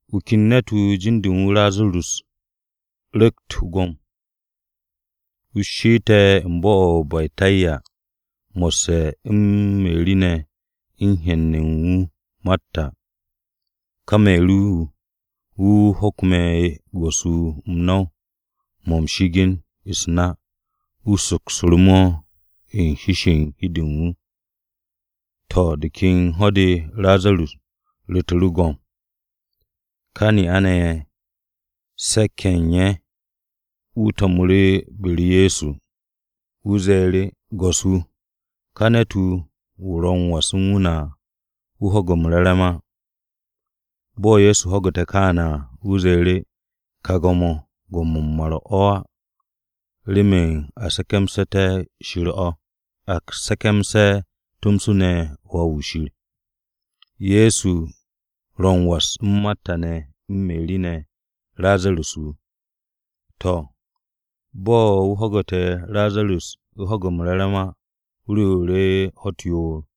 Wu̱ ken ne̱t-wu̱ jin-de u̱n wu̱ Razarus ru̱kt go̱m. Wu̱ she'ette̱ u̱n bo̱-o̱ o-Betanya, mo̱sse̱ u̱n Meri ne̱ u̱n hen u̱n wu̱ Marta. Ka Meri-wu̱, wu̱ wu̱ hokme̱ Go̱s-wu̱ m-no̱w mo̱ m-shi'igin u̱s-na. Wu̱ sokmu̱ru̱ mo̱ u̱n hi-se u̱n hi-de u̱n wu̱. To̱, de ken ho̱-de Razarus ru̱tu̱ru̱ go̱m. Ka ne'a-ne̱ ye̱, se̱k-ye̱ ne̱ u̱n wu̱ ne̱ to̱mu̱ru̱ be-u̱r Ye̱so, ye̱ ze̱e̱ru̱, “Go̱s-wu̱, ka ne̱t-wu̱, wu̱ o ro̱ m-was u̱n wu̱ ne̱ à, wu̱ ho̱ge̱ m-re̱re̱m á.” Bo̱ Ye̱so ho̱gu̱te̱ kááne̱ à, wu̱ ze̱e̱ru̱, “Ka go̱m-o̱, go̱m-o̱ m-mar o̱ á, remen a se̱ke̱msu̱té̱ Shir o̱, a se̱ke̱mse̱ tomso ne̱ Wà-wu̱ Shir.” Ye̱so ro u̱n was u̱n Marta ne̱ u̱n Meri ne̱, Razarus wu̱. To̱, bo̱ wu̱ ho̱gu̱te̱ Razarus u̱ ho̱ge̱ m-re̱re̱m á, wu̱ rewu̱ru̱ ho̱-u̱t yoor.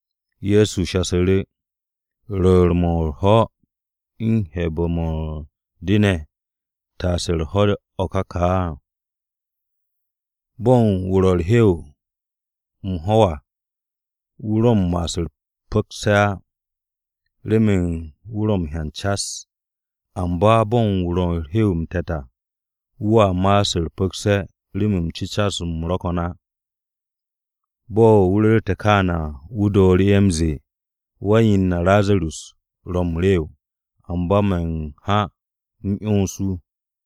Ye̱so shasu̱ru̱, “¿Rwu̱u̱n-mo̱ u̱r-ho̱ u̱n 'he̱be̱-mo̱ u̱n de ne̱ taase u̱r-ho̱ o̱ ka ka? Bo̱n wu̱ ro̱ u̱r-hew m-ho̱w à wu̱ ro̱ m-ma'as u̱t-pu̱kse̱ á, remen wu̱ ro̱ m-hyan cas. Amba bo̱n wu̱ ro̱ u̱r-hew m-te̱t à wu̱a ma'as u̱t-pu̱kse̱ remen cecas-m ro̱ ko̱n á.” Bo̱ wu̱ ru̱rte̱ kááne̱ à, wu̱ dooru̱ m-ze̱e̱, “Wan-yen na Razarus ro̱ m-rew, amba me̱ m-ha m-'yons wu̱.”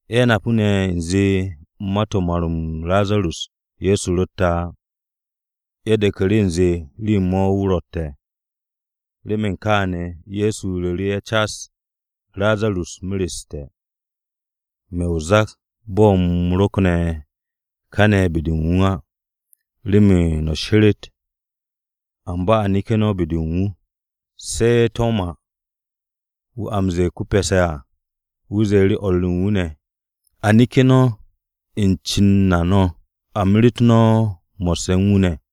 Ye̱ napu̱ ne̱ u̱nze, ma-to̱ u̱n mar-m Razarus Ye̱so ro̱tte̱ á. Ye̱ de̱ku̱ru̱ u̱nze rew-mo̱ wu̱ ro̱tte̱. Remen kaane̱ Ye̱so ru̱ru̱ ye̱ cas, “Razarus mereste̱. Me̱ o-zak bo̱ me̱ rokne̱ káne̱ be-de u̱n wu̱ á, remen no̱ she̱re̱t. Amba a neke̱ no̱ be-de u̱n wu̱.” Se̱ Toma, wu̱ a m-ze̱e̱ ko-Pe̱se̱ à, wu̱ ze̱e̱ru̱ o̱r u̱n wu̱ ne̱, “A neke̱ no̱ u̱n cen na no̱ a meret no̱ mo̱sse̱ u̱n wu̱ ne̱.”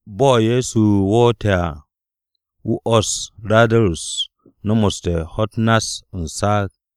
Bo̱ Ye̱so woote̱ à, wu̱ 'wo̱ss Razarus nomoste̱ ho̱-u̱t nass u̱n saag.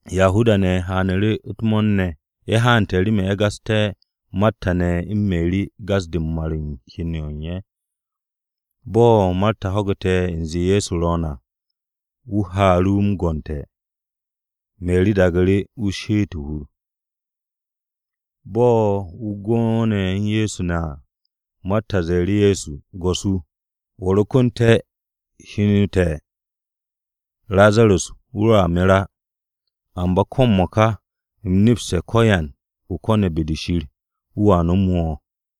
Yahuda-ne̱ haanu̱ru̱ u̱t-mo̱o̱r ne̱. Ye̱ haante̱ remen ye̱ gasté̱ Marta ne̱ u̱n Meri gas-de u̱n mar-m hen u̱n ye̱. Bo̱ Marta ho̱gu̱te̱ u̱nze Ye̱so ro̱o̱n à, wu̱ haaru̱ wu̱ m-gonte̱. Meri daagu̱ru̱ wu̱ she'et o-hur. Bo̱ wu̱ go'one̱ u̱n Ye̱so ne̱ à, Marta ze̱e̱ru̱ Ye̱so, “Go̱s-wu̱, wo̱ rokonte̱, heno te̱ Razarus wu̱ roa mer á. Amba ko̱ m-mo̱ka u̱m nepste̱ ko̱yan o ko̱ne̱ be-de Shir, wu̱a nomo wo̱.”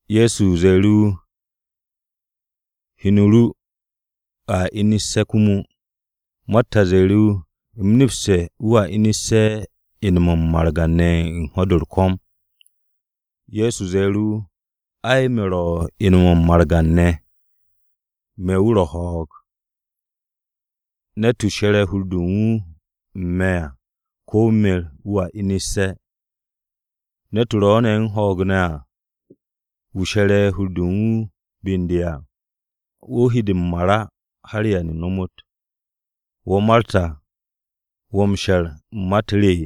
Ye̱so ze̱e̱ru̱ wu̱, “Heno ru a inu̱sse̱ komo.” Marta ze̱e̱ru̱ wu̱, “U̱m nepste̱ wu̱a inu̱sse̱ ine̱-mo̱ m-margan ne̱ ho̱-de u̱r-ko̱m.” Ye̱so ze̱e̱ru̱ wu̱, “Ai, me̱ wu̱ ro̱ ine̱-mo̱ u̱n margan-ne̱. Me̱ wu̱ ro̱ ho̱o̱g. Ne̱t-wu̱ she̱re̱ hur-de u̱n wu̱ u̱n me̱ à, ko̱ wu̱ mer, wu̱a inu̱sse̱. Ne̱t-wu̱ ro̱ ne̱ u̱n ho̱o̱g ne̱ à, wu̱ she̱re̱ hur-de u̱n wu̱ be u̱n de à, wu̱ he de m-mar á har da-o̱ ba m-ta. ¿Wo̱ Marta wo̱ m-she̱r u̱n ma-u̱t re?”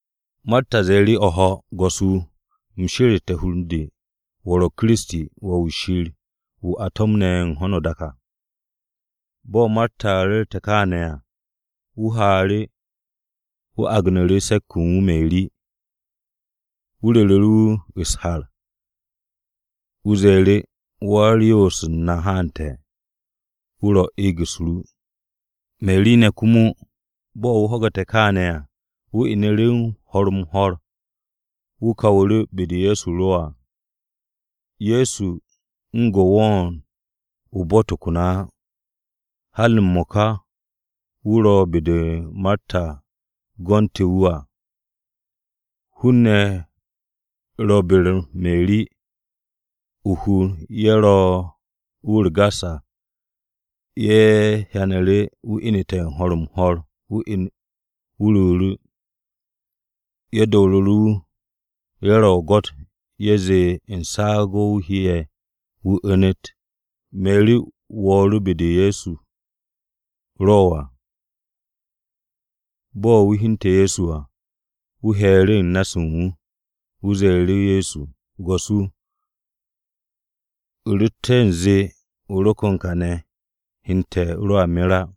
Marta ze̱e̱ru̱ wu̱, “O̱ho̱, Go̱s-wu̱, u̱m sheru̱ste̱ hur u̱n de, wo̱ ro̱ Kiristi, Wà-wu̱ Shir wu̱ a to̱mne̱ u̱n ho̱no o-dak à.” Bo̱ Marta ru̱rte̱ kaane̱ à, wu̱ haaru̱, wu̱ agnu̱ru̱ se̱k-wu̱ u̱n wu̱ Meri. Wu̱ ru̱ru̱ wu̱ u̱s-har, wu̱ ze̱e̱ru̱, “Wa-u̱r-Yoos na haante̱. Wu̱ ro̱ u̱n eeg-u̱s ru.” Meri ne̱ komo, bo̱ wu̱ ho̱gu̱te̱ kááne̱ à, wu̱ inu̱ru̱ ho̱r-m-ho̱r, wu̱ kawu̱ru̱ be-de Ye̱so ro à. Ye̱so u̱n go̱ wo̱o̱n o-bo̱ tokon á. Har m-mo̱ka wu̱ ro̱ be-de Marta gonte̱ wu̱ à. Hun-ne̱ ro be-u̱r Meri, o-hur ye̱ ro wu̱ u̱r-gas à, ye̱ hyanu̱ru̱ wu̱ inu̱te̱ ho̱r-m-ho̱r, wu̱ ruuru̱. Ye̱ do̱ru̱ru̱ wu̱, ye̱ ro̱ o-gwo̱t ye̱ zee u̱n saag o̱ wu̱ heye̱ wu̱ u̱nu̱t. Meri wo̱o̱ru̱ be-de Ye̱so ro à. Bo̱ wu̱ hyente̱ Ye̱so à, wu̱ he̱e̱ru̱ u̱n na-se u̱n wu̱. Wu̱ ze̱e̱ru̱ Ye̱so, “Go̱s-wu̱, u̱ rotte̱ u̱nze o rokon kàne̱ hen te̱ roa mer á.”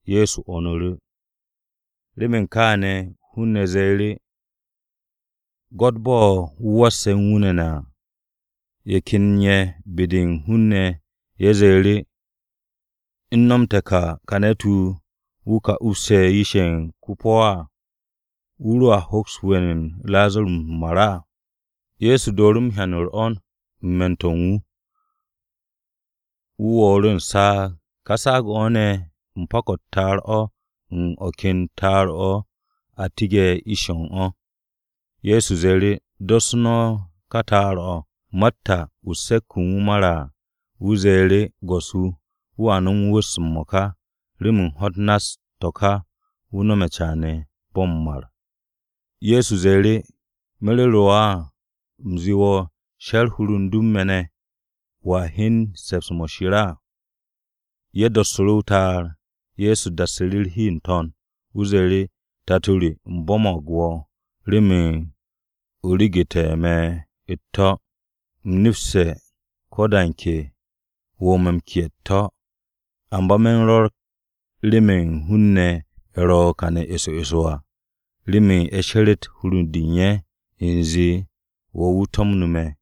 Ye̱so 'wo̱nu̱ru̱. Remen kááne̱ hun-ne̱ ze̱e̱ru̱, “Gwo̱t bo̱ wu̱ wasse̱ u̱n wu̱ ne̱ à!” Ye̱ ken ye̱ be-de u̱n ka hun-ne̱ ye̱ ze̱e̱ru̱, “¿U̱ no̱m te̱ ka, ka ne̱t-wu̱, wu̱ ka upse̱ yish-ye̱ u̱n ko-po̱ á? ¿Wu̱ roa hoks we̱n u̱n Razarus m-mar á?” Ye̱so dooru̱ hyan u̱r-'wo̱n u̱n me̱n-to̱ u̱n wu̱. Wu̱ wo̱o̱nu̱ru̱ u̱n saag. Ka saag-o̱ ne̱ pak-o̱ u̱t-ta'ar o̱ u̱n o̱ ken ta'ar-o̱ a tige̱ u̱n ish-o̱ u̱n o̱. Ye̱so ze̱e̱ru̱, “Dos no̱ ka ta'ar-o̱.” Marta, wu̱ se̱k-wu̱ u̱n wu̱ mare̱ à, wu̱ ze̱e̱ru̱, “Go̱s-wu̱ re, wu̱a nomos wu̱s m-mo̱ka, remen ho̱-u̱t nass to̱ ka wu̱ caane̱ bo̱ m-mar.” Ye̱so ze̱e̱ru̱, “¿Me̱ ru̱ru̱ wo̱ o̱ á, u̱m zee wo̱ she̱r hur u̱n du u̱n me̱ ne̱, wo̱a hyen se̱ps-mo̱ Shir à?” Ye̱ dossu̱ru̱ o-ta'ar. Ye̱so dassu̱ru̱ u̱r-hi n-to̱n. Wu̱ ze̱e̱ru̱, “Tato re, u̱m bo̱mo̱g wo̱ remen o regu̱te̱ me̱ u̱t-to̱. U̱m nepste̱ ko̱ da u̱n ke o ro̱ me̱ u̱n ke'e̱ u̱t-to̱. Amba me̱ u̱n rwo̱r remen hun-ne̱ ye̱ ro̱ kàne̱ eso eso à, remen ye̱ she̱re̱t hur-de u̱n ye̱ u̱nze wo̱ wu̱ to̱mnu̱ me̱.”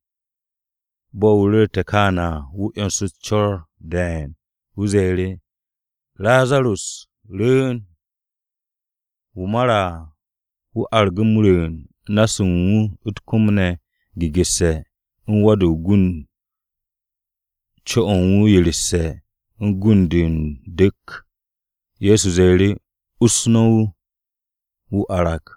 Bo̱ wu̱ ru̱rte̱ kááne̱ à, wu̱ 'yonsu̱ru̱ u̱s-co̱r de̱e̱n, wu̱ ze̱e̱ru̱, “Razarus, rwu̱u̱n!” Wu̱ mare̱ à wu̱ argu̱ m-rwu̱u̱n, na-se u̱n wu̱ u̱t-kom ne̱ gegu̱rse̱ u̱n wa-de o-gund, co-o̱ u̱n wu̱ yeresse̱ u̱n gund-de u̱n du̱k. Ye̱so ze̱e̱ru̱, “Us no̱ wu̱, wu̱ arag!”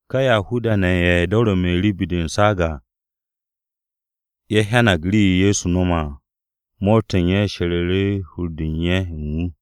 Ka Yahuda-ne̱ ye̱ do̱re̱ Meri be-de u̱n saag à, ye̱ hyang rii-yo Ye̱so no̱me̱ à, mo̱o̱r-to̱ u̱n ye̱ she̱ru̱ hur-de u̱n ye̱ u̱n wu̱.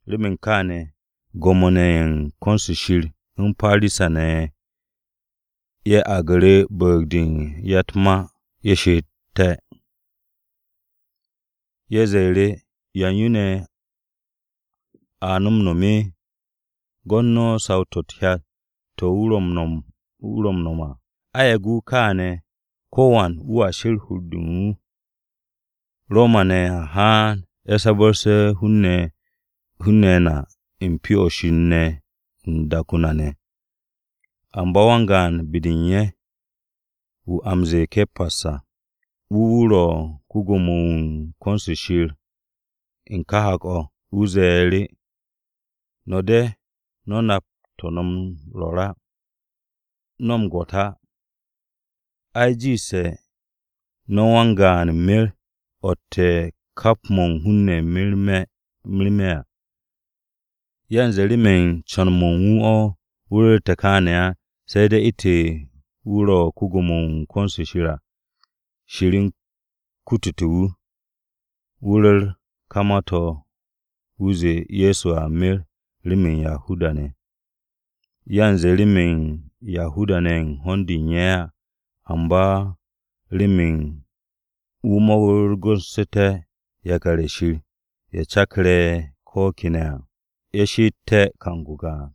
Remen kááne̱ Gwo̱mo-ne̱ ye̱ u̱n ko̱n-se Shir u̱n Parisa-ne̱ ne̱ ye̱ aagu̱ru̱ Mo̱ro̱g-de u̱n Se̱k-ye̱ remen ye̱ piishté̱ u̱t-ma. Ye̱ ze̱e̱ru̱, “¿Ya u̱n yo ne̱ a no̱ m-no̱m? Gwo̱t no̱ saw-to̱ u̱t-hyat to̱ wu̱ ro̱ m-nom à! A yage̱ wu̱ kááne̱, ko̱wan wu̱a sher u̱r-hur u̱n wu̱. Roma-ne̱ a haan, ye̱ sabarse̱ hun-ne̱ na u̱n Pyo-o̱ Shir ne̱ u̱n dak-o na ne̱.” Amba wan-gaan be-de u̱n ye̱, wu̱ a m-ze̱e̱ Ke̱pas à, wu̱ wu̱ ro ko-Gwo̱mo-wu̱ u̱n ko̱n-se Shir u̱n ka hak-o̱, wu̱ ze̱e̱ru̱, “No̱ de̱ no̱ nap to̱ no̱ m-rwo̱r á ¿No̱ m-gwo̱t á? Ai, jiishtu̱ no̱ wan-gaan mer o̱tte̱ kap mo̱ u̱n hun-ne̱ merme̱ à.” Yanze remen co̱n-mo̱ u̱n wu̱ o̱ wu̱ ru̱rte̱ kááne̱ á, se̱ de̱ u̱ntu̱n wu̱ ro ko-Gwo̱mo-wu̱ u̱n ko̱n-se Shir à, Shir u̱n kute̱ wu̱, wu̱ ru̱r ka ma-to̱ wu̱ zee Ye̱so a mer remen Yahuda-ne̱. Yanze ne̱ remen Yahuda-ne̱ u̱n ho̱n-de u̱n ye̱ á, amba remen wu̱ mo̱rgu̱nsu̱té̱ yakar-ye̱ Shir ye̱ ro̱ cakarse̱ ko̱ kene̱ à, ye̱ she'ete̱ kang-o gaan.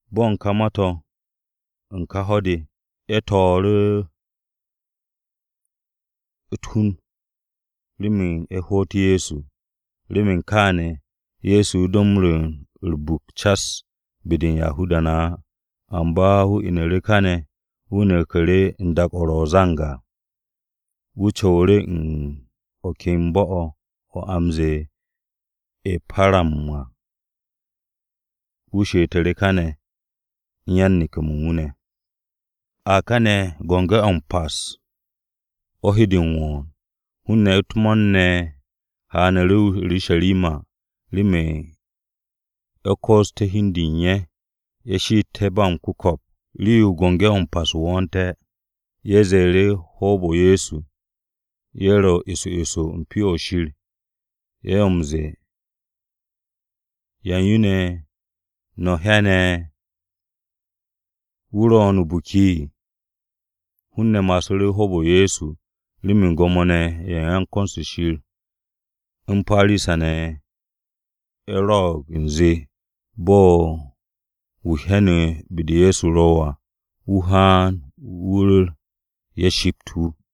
Bo̱ u̱n ka ma-to̱ u̱n ka ho̱-de, ye̱ to̱o̱ru̱ u̱t-hun remen ye̱ hoot Ye̱so. Remen kááne̱, Ye̱so do m-rwu̱u̱n u̱r-buk cas be-de u̱n Yahuda-ne̱ á. Amba wu̱ inu̱ru̱ káne̱, wu̱ neku̱ru̱ u̱n dak-o̱ ro̱ o-zang à. Wu̱ co̱wu̱ru̱ u̱n o̱ ken bo̱-o̱ o̱ a m-ze̱e̱ o-E̱param à. Wu̱ she'etu̱ru̱ káne̱ u̱n yan-neke̱-mo̱ u̱n wu̱ ne̱. A kane̱, Biki-o̱ m-Pas o̱ u̱n he de m-wo̱o̱n. Hun-ne̱ u̱t-mo̱o̱r ne̱ ye̱ haaru̱ o-Urusharima remen ye̱ koosté̱ hi u̱n de u̱n ye̱ ye̱ she'eté̱ ba m-ku̱ko̱p rii-yo Biki-o̱ m-Pas wo̱o̱nte̱. Ye̱ ze̱e̱ru̱ hoob-o Ye̱so, ye̱ ro̱ eso eso u̱n Pyo-o̱ Shir. Ye̱ m-ze̱e̱, “¿Ya u̱n yo ne̱ no̱ hyane̱? ¿Wu̱ ro̱o̱n o-biki?” Hun-ne̱ ma'asu̱ hoob-o Ye̱so, remen Gwo̱mo-ne̱ ye̱ u̱n ko̱n-se Shir u̱n Parisa-ne̱ ne̱ ye̱ rwo̱'o̱g u̱nze bo̱ u̱n wu̱ hyane̱ be-de Ye̱so ro à, wu̱ haan, wu̱ ru̱r, ye̱ shipt wu̱.